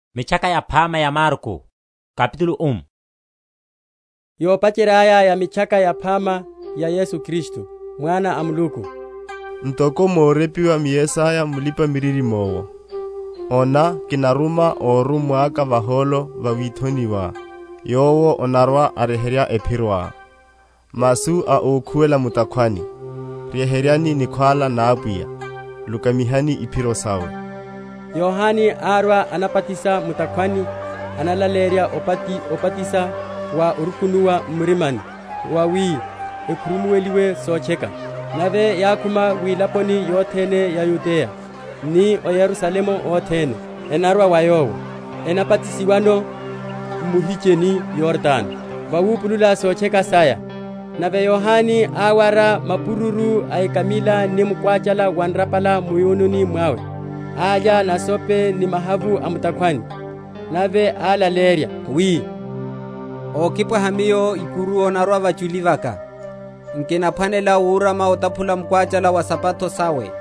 Yohane Mbatisi. Yopacherya aya ya Mitchaka Yaphama ya Yesu Kristu, Mwana a Muluku. Ntoko morepiwa m’Yesaya Mulipa‐miririmo’wo, Ona, kinaruma órummwa aka vahólo va withoni wá, Yowo anarwa‐aryeherya ephiroá; Masu a ókhuwela mu’takhwani, Ryeheryani nikhwála na Apwiya, Lukamihani iphiro sawe; Yohane árwa anabatisa mu’takhwani analaleyerya obatisa wa orukunuwa m’murima wawi ekhurumuweliwe sotcheka. Nave yákhuma wilaponi yothene ya Yudeya, ni a o Yerusalemu othene, enarwa wa yowo, enabatisiwano m’muhicheni Yordano, vawupulula sotcheka saya. Nave Yohane áwara mapururu a ekamila ni mukwachala wa nrapala mu’yununi mwawe, alya nasope ni mahavu a mu’takhwani. Nave álaleyerya, wi, ókipwaha miyo ikuru anarwa vachuli vaka, nkinaphwanela wurama otaphula mukwachala wa isapato sawe.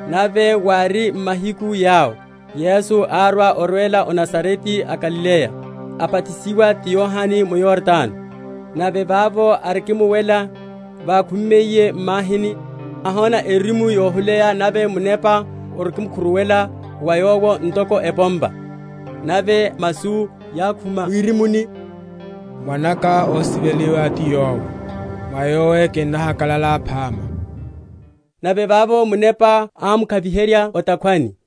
Nave wári m’mahiku yawo, Yesu árwa orwela o Nazarete a Galileya, abatisiwa ti Yohane mu Yordano. Nave vavo arikimuwela vákhumiye m’mahini, áhona erimu yohuleya nave Munepa arikimukhuruwela va Yowo ntoko epompa; nave masu yákhuma mwirimuni, Mwana’ka ósiveliwa ti yowe, mwa Yowe kinnahakalala phama. Nave vavo Munepa ámwakuviherya o’takhwani.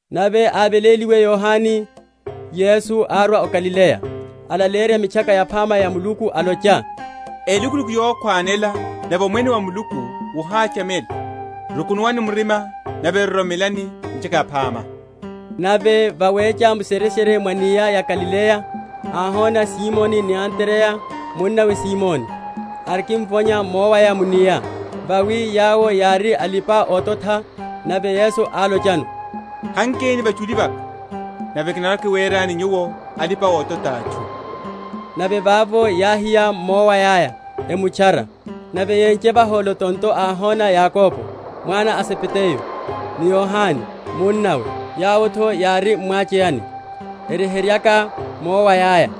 Nave aveléliwe Yohane, Yesu árwa o Galileya, alaleyerya Mitchaka Yaphama ya Muluku, alocha, Elukuluku yokhwanela nave omwene wa Muluku wohachamela; rukunuwani m’mirima nave roromelani Mitchaka Yaphama. Nave vawecha mu’shereshere mwa’nia ya Galileya áhona Simoni ni Andreya munnawe a Simoni, erikimvonya mowaya mu’nia; vawi yawo yári alipa‐ototha. Nave Yesu álochano, Hankeni vachuli vaka nave kinarwa‐kiwerani nyuwo alipa‐ototha a atchu. Nave vavo yáhiya miowaya’ya emutchara. Nave yénche vahólo tonto áhona Yakobo, mwana a Zebedayo, ni Yohane munnawe, yawo’tho yári m’mwacheyani, eryeheryaka miowaya’ya.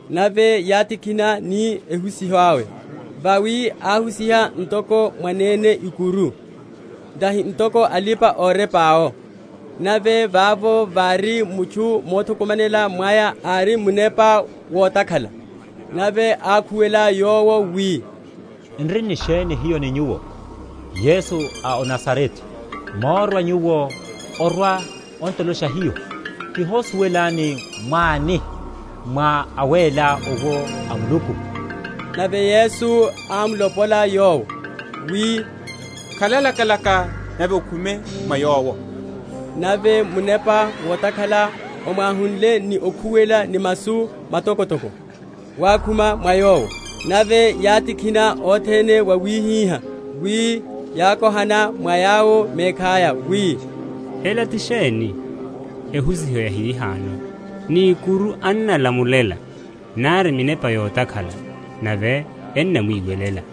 Nave yátikhina ni ehusiho awe; vawi áhusiha ntoko mwanene ikuru, tahi ntoko alipa‐orepa’wo. Nave vavo vári mutchu mothukumanela mwaya ári ni munepa wotakhala; nave ákhuwela yowo wi, N’ri ni sheni hiyo ni Nyuwo, Yesu a o Nazarete? Morwa Nyuwo orwa‐on’tolosha hiyo? Kihosuwelani mwáni, mwá awéla owo a Muluku. Nave Yesu ámlopola yowo wi, Khala lakalaka nave okhume mwa yowo. Nave munepa wotakhala omwahunle ni okhuwela ni masu matokotoko, wákhuma mwa yowo. Nave yátikhina othene wawihihá wi yákohana mwa yawo mekhaya wi, Ela ti sheni? ehusiho yahihano! ni ikuru annalamulela nari minepa yotakhala nave ennamwiwelela.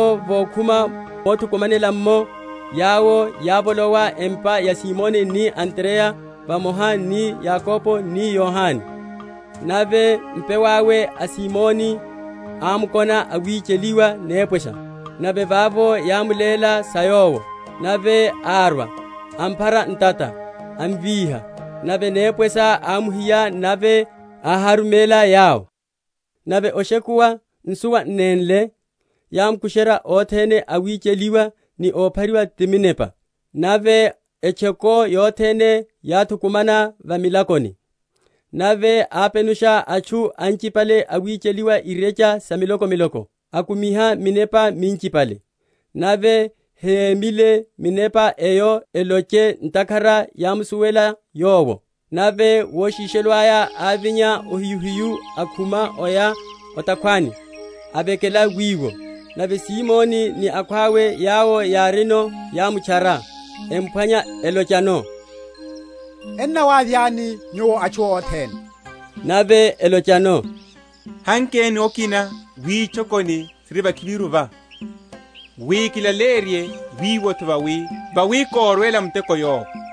Nave vavo vokhuma mothukumanela’mmo, yawo yávolowa empa ya Simoni ni Andreya vamoha ni Yakobo ni Yohane. Nave mpew’awe a Simoni ámkona awicheliwa nepwesha; nave vavo yámuléla sa yowo; nave árwa, amphara ntata, amvíha; nave nepwesha ámuhiya, nave áháruméla yawo. Nave oshekuwa, nsuwa n’nénle, yámukusherya othene awicheliwa ni óphariwa ti minepa. Nave etchoko yothene yáthukumana va milakoni. Nave ápenusha atchu anchipale awicheliwa irecha sa miloko?-?miloko, akumiha minepa minchipale; nave hémyile minepa eyo eloche ntakhara yámsuwela Yowo. Nave woshishelo aya ávinya ohiyuhiyu, akhuma, aya o’takhwani, avekela wiwo. Nave Simoni ni akhwawe yawo yárino yámutchara, emphwanya, elochano, Ennawavyani Nyuwo atchu othene. Nave álochano, Hankeni okina witchokoni siri vakhiviru va, wi kilaleyerye wiwo’tho; vawi korwela muteko yowo.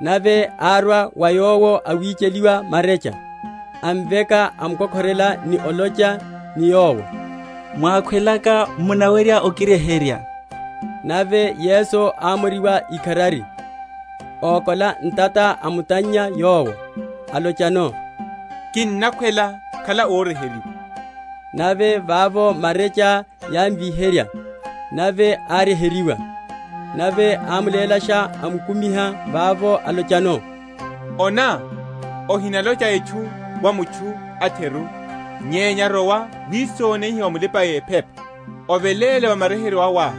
Nave árwa wa Yowo awicheliwa marecha, amveka, amukokhorela, ni olocha ni Yowo, Mwákhwelaka, munawerya okiryeherya. Nave Yesu ámoriwa ikharari, ókola ntata, amutannya yowo, alochano, Kinnakhwela; khala óryeheryiwa. Nave vavo marecha yámvinyerya, nave áryeheryiwa. Nave ámulélasha, amukumiha vavo, alochano, Ona, ohinalocha etchu wa mutchu a’theru; nyenya rowa wisoneihe wa mulipa‐ephepa, oveléle va maryeheryeyo awá,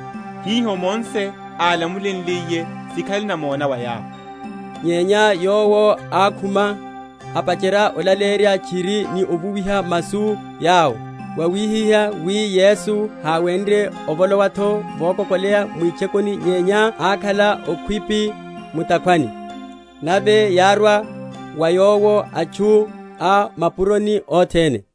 hiho Mose álamulenliye, sikhale namona wa yawo. Nyenya yowo ákhuma, apacherya olaleyerya tchiri ni ovuwiha masu yawo, wawihihá wi Yesu háwenrye ovolowa’tho vokokoleya mwitchokoni nyenya ákhala okhwipi mu’takhwani; nave yárwa wa Yowo atchu a o mapuroni othene.